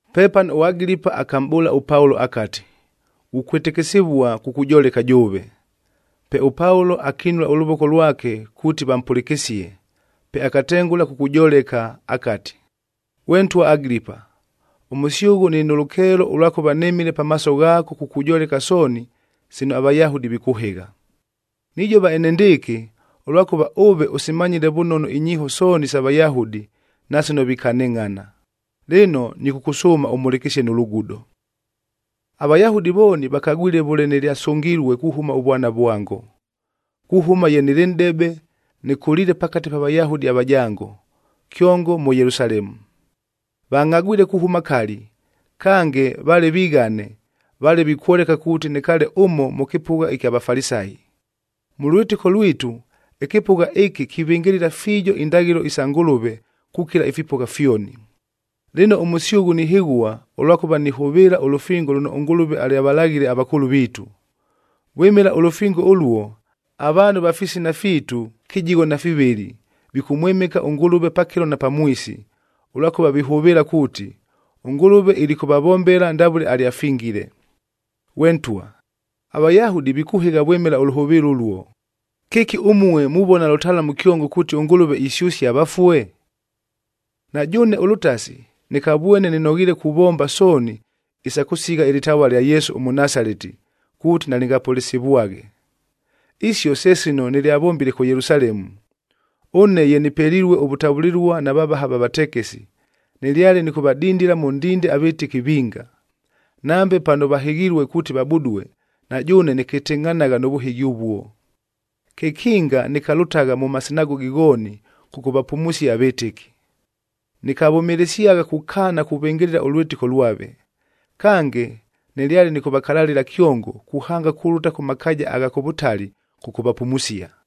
Pepano ʉAgilipa akamʼbʉʉla ʉPaulo akati, “Ghukwɨtɨkɨsɨvua kukujoleka jʉʉve.” Pe ʉPaulo akinula ʉlʉvoko lwake kuuti vampʉlɨkɨsie, pe akatengʉla kukujoleka akati, “Ghwe ntwa Agilipa, ʉmʉsyʉghʉ nɨlɨ nʉ lʉkeelo ʉlwakʉva nɨmile pamaaso ghaako kukujoleka sooni sino aVayahudi vikʉhɨgha. Nijova enendɨɨkɨ, ʉlwakʉva ʉve ʉsimanyile vʉnono inyiiho sooni isa Vayahudi, na sino vikanɨngʼhana. Lɨno, nɨkʉkʉsʉʉma ʉmhʉlɨkɨsie nʉ lugudo. “AVayahudi vooni vakagwile vʉle nɨlyasʉngilue kuhʉma ʉvwana vwango. Kuhʉma ye nɨlɨ nʼdebe, nɨkʉliile pakate pa Vayahudi avajango, kyongo mʉ Yelusalemu. Vangʼhagwile kuhʉma kali, kange vale vighane, vale vikwoleka kuuti nɨkaale ʉmo mʉ kɨpʉgha ɨkya Vafalisayi. Mʉ lwɨtɨko lwitu ɨkɨpʉgha ɨkɨ kivɨngɨlɨla fiijo indaghɨlo isa Ngʉlʉve kukila ifipʉgha fyoni. Lɨno ʉmʉsyʉghʉ nihɨghua, ʉlwakʉva nihʉvɨɨla ʉlʉfingo lʉno ʉNgʉlʉve alyavalaghile avakʉʉlʉ viitu. Vwɨmɨla ʉlʉfingo ʉluo, avaanhu va fisina fiitu kɨjigho na fivɨlɨ vikʉmwɨmɨka ʉNgʉlʉve pakɨlo na pamwisi, ʉlwakʉva vihʉvɨɨla kuuti, ʉNgʉlʉve ilikʉvavombela ndavʉle alyafingile. Ghwe ntwa, aVayahudi vikʉhɨgha vwɨmɨla ʉlʉhʉvɨɨlo ʉluo! Kɨki ʉmue muvona lʉtalamu kyongo kuuti ʉNgʉlʉve isyʉsia avafue? “Na jʉʉne ʉlʉtasi nɨkavwene nɨnoghiile kuvomba sooni isa kʉsigha ɨlɨtavua lya Yesu ʉMʉnasaleti kuuti nalɨngapʉlɨsivwaghe. Isio se sino nɨlyavombile kʉ Yelusalemu. Ʉne ye nɨpelilue ʉvʉtavʉlɨlua na vavaha va vatekesi, nɨlyale nɨkʉvadindila mʉ ndinde avɨtɨki vinga. Nambe pano vahɨghilue kuuti vabudue, na jʉʉne nɨkɨtɨngʼhanagha nʉ vʉhɨghi ʉvuo. Kekinga nɨkalʉtagha mʉ masinagogi ghooni kʉkʉvapumusia avɨtɨki. Nɨkavʉmɨlɨsyagha kukaana kuvɨngɨlɨla ʉlwɨtɨko lwave. Kange, nɨlyale nɨkʉvakalalɨla kyongo kuhanga kulʉta kʉ makaaja agha kʉ vʉtali kʉkʉvapumusia.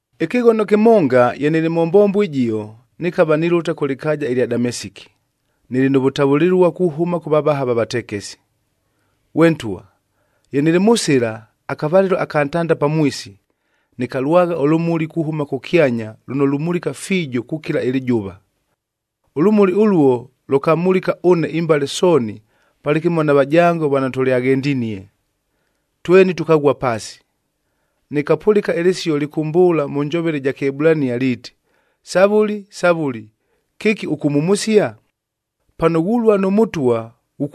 “Ɨkɨghono kɨmonga ye nɨlɨ mʉ mbombo ɨjio, nɨkava nilʉta kʉ lɨkaaja ɨlya Damesiki, nɨlɨ nʉ vʉtavʉlɨlua kuhʉma kʉ vavaha va vatekesi. Ghwe ntwa! Ye nɨlɨ mʉ sɨla, akavalɨlo aka ntanda pamwisi, nɨkalwagha ʉlʉmuli kuhʉma kʉkyanya lʉno lumulika fiijo kukila ɨlɨjʉva. Ʉlʉmuli ʉluo lʉkamulika ʉne imbale sooni palɨkɨmo na vajango vano tʉlyaghendinie, tweni tʉkaghua paasi. Nɨkapʉlɨka ɨlɨsio lɨkʉmbʉʉla mʉ njovele ɨja Kɨebulania liiti, ‘Savʉli, Savʉli, kɨki ʉkʉmhumusia? Pano ghulua nʉ Mʉtwa,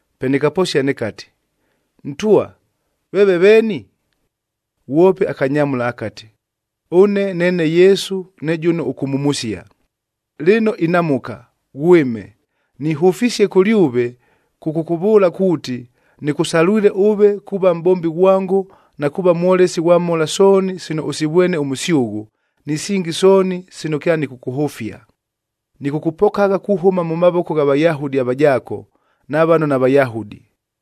“Pe nɨkaposia nɨkati, ‘Ntwa, veeve veeni?’ Ghwope akanyamʉla akati, ‘Ʉne neene Yesu ne jʉno ʉkʉmhumusia. Lɨno inamʉka, ghwɨme! Nihʉfisie kʉlyʉve kʉkʉkʉvʉʉla kuuti, nɨkʉsalwile ʉve kuuva mʼbombi ghwango na kuuva mwolesi ghwa mhola sooni sino ʉsivwene ʉmʉsyʉghʉ, ni singi sooni sino kyanɨkʉkʉhʉfia. Nɨkʉkʉpokagha kuhʉma mʉ mavoko gha Vayahudi avajaako, na vano naVayahudi.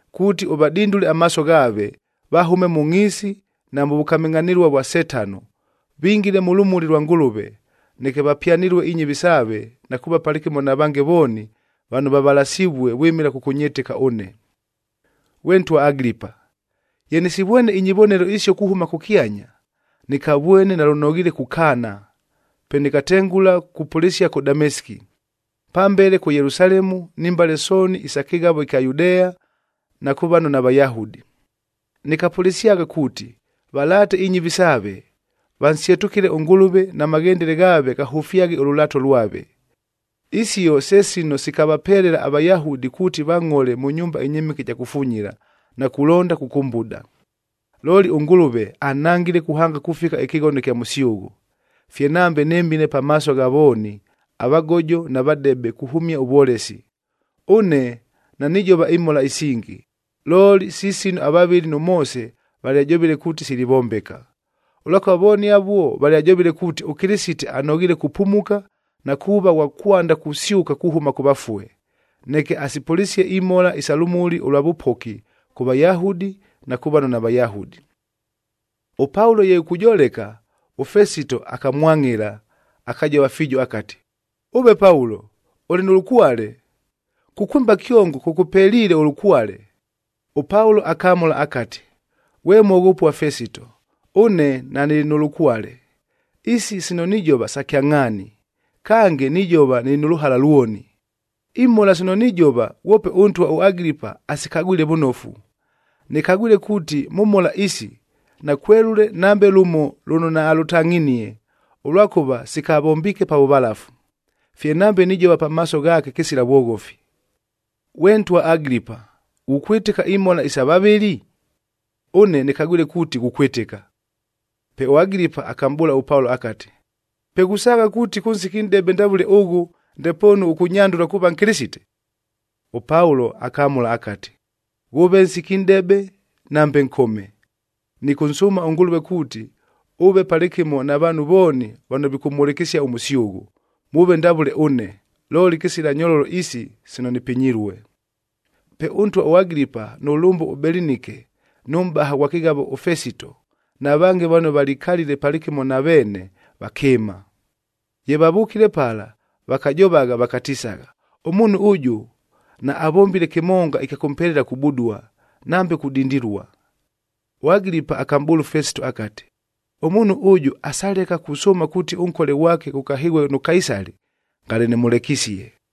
kuuti ʉvadindule amaaso ghaave, vahʉme mʉ ngʼhiisi na mʉ vʉkamɨngʼhanɨlua vwa Setano, vingile mʉ lʉmuli lwa Ngʉlʉve, neke vapyanɨlue inyɨvi saave na kuuva palɨkɨmo na vange vooni vano vavalasivue vwɨmɨla kʉkʉnyɨtɨka ʉne.’ “Ghwe ntwa Agilipa, ye nɨsivwene inyivonelo isio kuhʉma kʉkyanya, nɨkavwene nalʉnoghiile kukaana. Pe nɨkatengʉla kupʉlɨsia kʉ Damesiki, pambele kʉ Yelusalemu ni mbale sooni isa kɨghavo ɨkya Yudea na kʉ vano naVayahudi. Nɨkapʉlɨsyagha kuuti valaate inyɨvi saave, vansyetʉkɨle ʉNgʉlʉve na maghendele ghaave ghahʉfyaghe ʉlʉlaato lwave. Isio se sino sikavapelela aVayahudi kuuti vangʼhole mʉ nyumba ɨnyɨmɨke ɨja kufunyila, na kulonda kʉkʉmbuda. Looli ʉNgʉlʉve anhangile kuhanga kufika ɨkɨghono ɨkya mʉsyʉghʉ, fye nambe nɨmile pamaaso gha vooni, avagojo na vadebe kuhʉmia ʉvwolesi. Ʉne nanijova imhola isingi, looli si sino avavɨli nʉ Moose valyajovile kuuti silivombeka. Ʉlwakʉva vooni avuo valyajovile kuuti ʉKɨlɨsite anoghiile kupumuka, na kuuva ghwa kwanda kusyʉka kuhʉma kʉ vafue, neke asipʉlɨsie imhola isa lʉmuli ʉlwa vʉpoki kʉ Vayahudi, na kʉ vano naVayahudi.” ɄPaulo ye ikujoleka, ʉFesito akamwangʼɨla, akajova fiijo akati, “Ʉve Paulo! Ʉlɨ nʉ lʉkwale! Kukwɨmba kyongo kʉkʉpeliile ʉlʉkwale!” ɄPaulo akamʉla akati, “Ghwe mwoghopua Fesito, ʉne nanɨlɨ nʉ lʉkwale. Isi sino nijova sa kyangʼhaani, kange nijova nɨlɨ nʉ lʉhala lwoni. Imhola sino nijova ghwope ʉntwa ʉAgilipa asikagwile vʉnofu. Nɨkagwile kuuti mʉ mhola isi, nakwelʉle nambe lʉmo lʉno naalʉtangʼhinie, ʉlwakʉva sikavombiike pa vʉvalafu. Fye nambe nijova pamaaso ghaake kɨsila vwoghofi. Ghwe ntwa Agilipa, ghukwɨtɨka imhola isa vavɨli? Ʉne nɨkagwile kuuti ghukwɨtɨka.” Pe ʉAgilipa akamʼbʉʉla ʉPaulo akati, “Pe ghusaagha kuuti kʉ nsiki ʉnʼdebe ndavʉle ʉghʉ, ndepoonu ʉkʉnyandʉla kuuva Nkɨlɨsite?” ɄPaulo akamʉla akati, “Ghʉʉve nsiki nʼdebe, nambe nkome, nɨkʉnsʉʉma ʉNgʉlʉve kuuti, ʉve palɨkɨmo na vaanhu vooni vano vikʉmhʉlɨkɨsia ʉmʉsyʉghʉ, mʉʉve ndavʉle ʉne, looli kɨsila nyololo isi sino nɨpinyilue.” Pe ʉntwa ʉAgilipa, nʉ lʉmbʉ ʉBelinike, nʉ mʼbaha ghwa kɨghavo ʉFesito, na vange vano valikalile palɨkɨmo na veene, vakɨɨma. Ye vavʉkile pala, vakajovagha vakatisagha, “Ʉmuunhu ʉjʉ naavombile kɨmonga ɨkya kʉmpelela kubudua, nambe kudindilua.” ɄAgilipa akamʼbʉʉla ʉFesito akati, “Ʉmuunhu ʉjʉ asaleka kusʉʉma kuuti ʉnkole ghwake ghʉkahɨghue nʉ Kaisali, ngale ʉmʉlekisie.”